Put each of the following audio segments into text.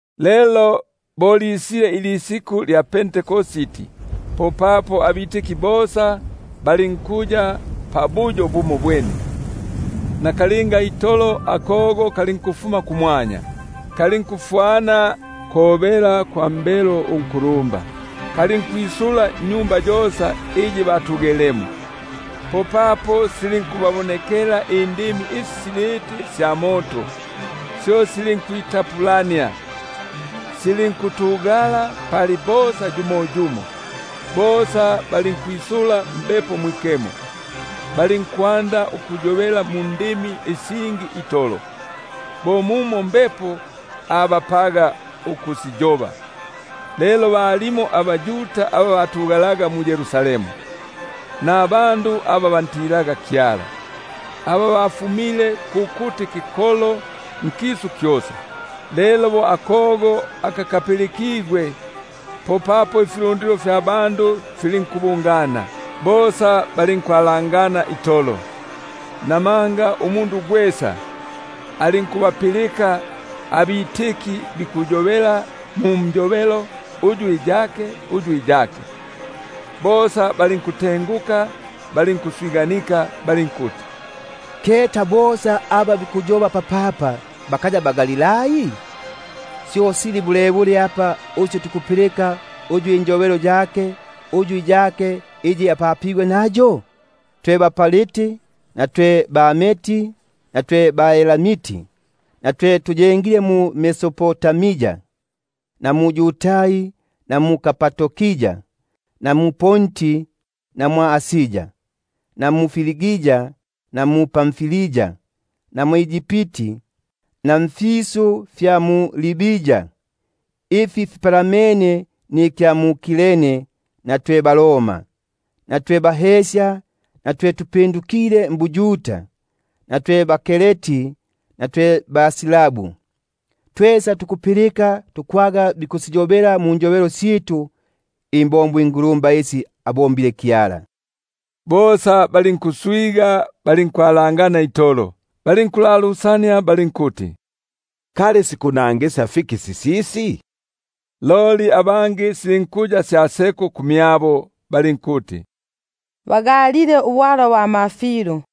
Lelo bo lisile ilisiku lya Pentekosti, popapo bosa balinkuya pamopene mbuyo bumobwene; nakalinga itolo akogo kalinkufuma kumwanya, kalinkufwana kobela kwa mbelo unkulumba; kalinkwisula nnyumba yosa iyi batugelemo. Popapo silinkubabonekela indimi isi siliti sya moto, syo silinkwi- tapulania, silinkutugala pali bosa yumo yumo; bosa balinkwisula Mbepo Mwikemo, balinkwanda ukuyobela mundimi isingi itolo, bo mumo Mbepo abapaga ukusiyoba. Lelo balimo abaYuda aba batugele mu-Yerusalemu, nabandu aba bantilaga Kyala, bo bafumile nifikolo fyosa kusi kumpalanga. Lelo bo akogo aka kapilikigwe, po ifilundilo filinkubungana, filinkwalangana itolo, namanga umundu gwesa alinkubapilika bikuyobela ndulimi lwake. Bosa balinkutenguka balinkuswiganika, balinkuti: Keta, bosa aba bikuyoba papapa bakaya baGalilai? Syo sili bulebule apa uswe tukupilika uyu injobelo yake, uyu iyake, iyi apapigwe nayo? Twe baPariti twe baMedi na twe baElamiti, na twe tuyengile mu-Mesopotamia, mu-Yudai na mu-Kapadokia, mu-Ponti na mwʼAsia, mu-Frigia na mu-Pamfilia, mwʼEgipti na mfisu fya Libia ifi fipalamene na Kireni, na twe baRoma twe bahesya, twe baYuda na twe bingisigwa mbuYuda, twe baKreti na twe baArabu; tukubapilika bikusiyobela mundimi syitu imbombo ingulumba isya Kyala. Bosa balinkutenguka balinkwalangana itolo, balinkulalusania bali- nkuti: Kali sikunangisya fiki sisisi? Loli abangi silinkuya sya seko kumyabo, balinkuti: Bagalile ubwalwa bwa mafilu.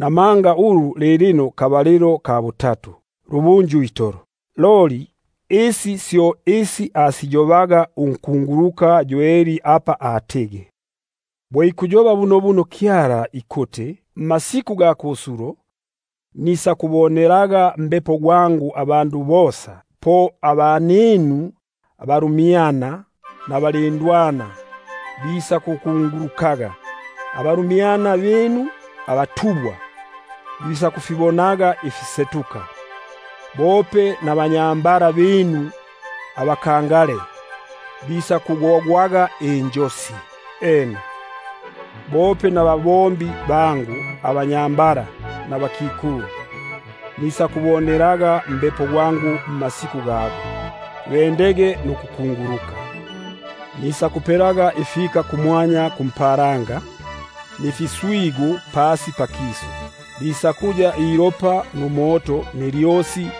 manga lilino kabalilo ka butatu, lubunju itolo. Loli isi syo isi asiyobaga unkunguluka Yoeli apa atigi: Bo ikuyoba bunobuno Kyala ikuti: Mmasiku ga kusulo, nisakubonelelaga Mbepo gwangu abandu bosa, Po abaninu abalumyana nabalindwana bisakukungulukaga, Abalumyana binu abatubwa bisakufibonaga ifisetuka; Bope nabakulumba binu bisakugogwaga injosi; Ena, bope abatumwa bangu abanyambala nabakikulu Nisakubonelelaga Mbepo gwangu mmasiku gago, Bende mbukunguluka. Nisakupelaga ifiswigu kumwanya kumpalanga, Nifika pasi pakisu, Ilopa numoto numuyi gwa lyosi.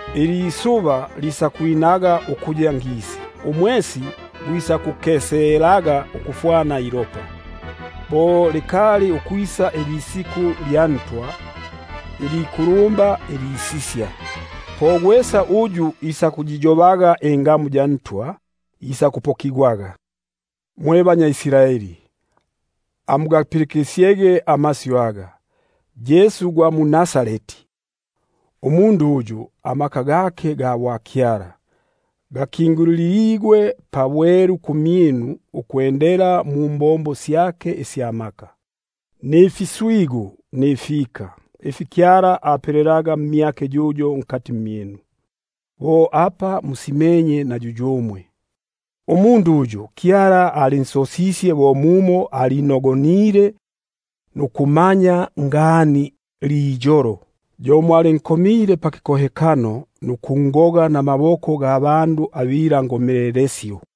Ilisuba lisakugalabukaga ukuya ngisi, Numwesi ukuya ilopa, Bo likali ukwisa ilisiku lya Ntwa ilikulumba ilisisya. Po gwesa uyu isakuyiyobaga ingamu ya Ntwa, isakupokigwaga. Mwe banyambala mwe baIsraeli, amugapilikisyege amasyu aga: Yesu gwa mu-Nazareti, umundu uyu Kyala abakingulile pabwelu nimbombo isya maka, mfiswigu nifika, ifi Kyala afipelelaga mmyake yuyo nkati mmyinu, bo apa musimenye na yuyumwe; umundu uyu Kyala alinsosisye bo mumo alinogonile nukumanyila ngani liyolo, yo mwalinkomile pakikohekano nukungoga namaboko ga bandu abilandagilo;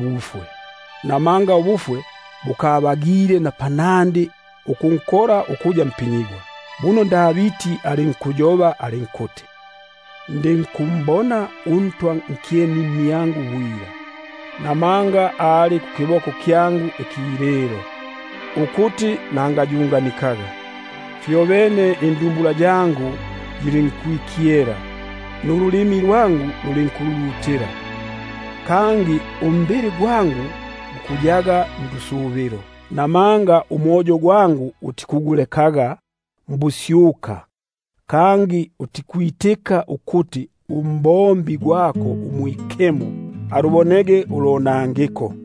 mbufwe, namanga ubufwe bukabagile ukunkola. Buno Davidi ikuyoba ikuti: Nikumbona uNtwa nkyeni mmyangu bwila, Namanga ali kukiboko kyangu ikililo, Ukuti nangayunganikaga. Fyobene indumbula yangu yilinkwikyela, Nululimi lwangu lulinkululutila, Kangi umbili gwangu gukuyaga ndusubilo; Namanga umoyo gwangu utikugulekaga mbusyuka, Kangi utikwitika ukuti uMwikemo gwako alubonege ulonangiko.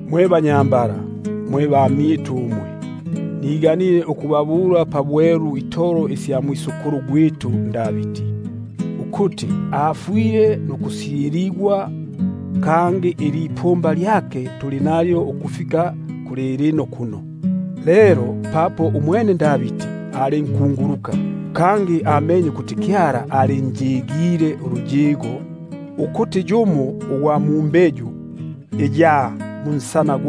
Mwe banyambala mwe bamyitu umwe, mbagile ukubabula pabwelu itolo isya mwisukulu gwitu Davidi, ukuti afwile nukusyiligwa, kangi ilipumba lyake tuli nalyo ukufika kulilino kuno. Lelo papo umwene ali nkunguluka, kangi amenye ukuti Kyala alinjigile uluyigo, ukuti yimo imbeyu ya munsana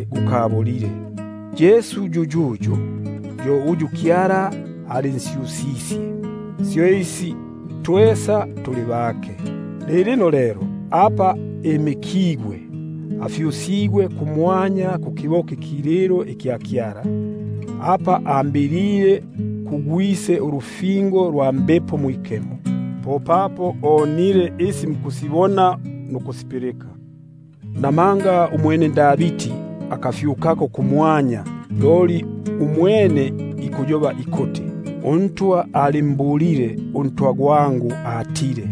ulonangiko. Yesu yuyuyu, yo uyu Kyala alinsyusisye, syo isi twesa tuli baketi. Lilino lelo apa imikigwe afyusigwe kukiboko ikililo ikya Kyala, apa ambilile kuGwise ulufingo lwa Mbepo Mwikemo, popapo onile isi mukusibona nukusipilika. Buno Davidi akafyukako kumwanya, loli umwene ikuyoba ikuti: UNtwa ayobile kuNtwa gwangu atile: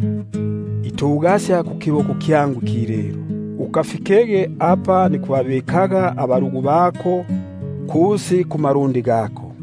Itugasya kukiboko kyangu ikililo; Ukafikege apa nikubabikaga abalugu bako kusi kumalundi gako.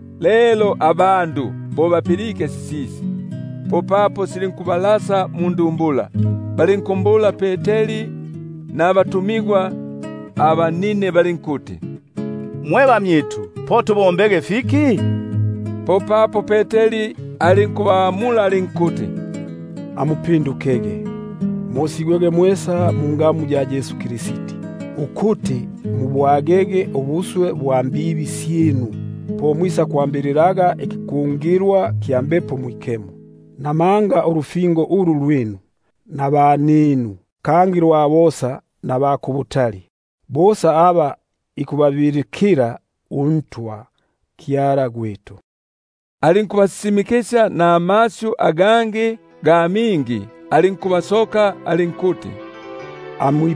Lelo bo bapilike sisisi, popapo silinkubalasa mundumbula, balinkumbula Peteri nabatumigwa abangi balinkuti: Mwe bamyitu, po tubombege fiki? Popapo Peteri alinkubabula alinkuti: Amupindukege, mosigwege mwesa mungamu ya Yesu Kristi, ukuti mubwage ubuswe bwa mbibi syinu, po mwisakwambililaga ikikungilwa kya Mbepo Mwikemo. Buno ulufingo ulu lwinu, nabaninu, kangi lwa bosa naba kubutali, bosa aba ikubabilikila uNtwa Kyala gwitu. Alinkubasisimikisya namasyu agangi ga mingi, alinkubasoka alinkuti: Amwi-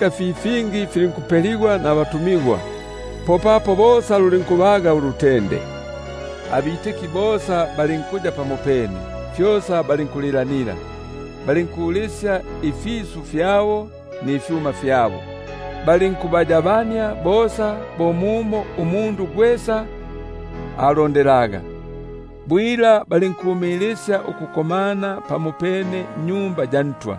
fi fingi filinkupeligwa nabatumigwa. Bosa aba balitike bali- nkuya pamopene, fyosa balinkulilanila; balinkulisya ifisu fyabo nifyuma fyabo, balinkubayabania bosa, bo mumo umundu gwesa agililwaga. Bwila balinkumilisya ukuya pamopene mwa Tempeli,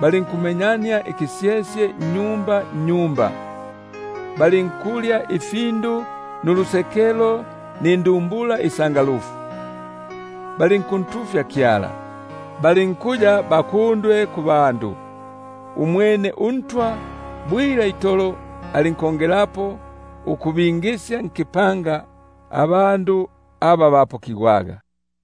balinkumenyania ikisyesye nnyumba nnyumba, balinkulya ifindu nulusekelo nindumbula isanga- lufu, balinkuntufya Kyala, balinkuya bakundwe kubandu bosa. Umwene uNtwa bwila itolo alinkongelapo ukubingisya nkipanga aba bapokigwaga.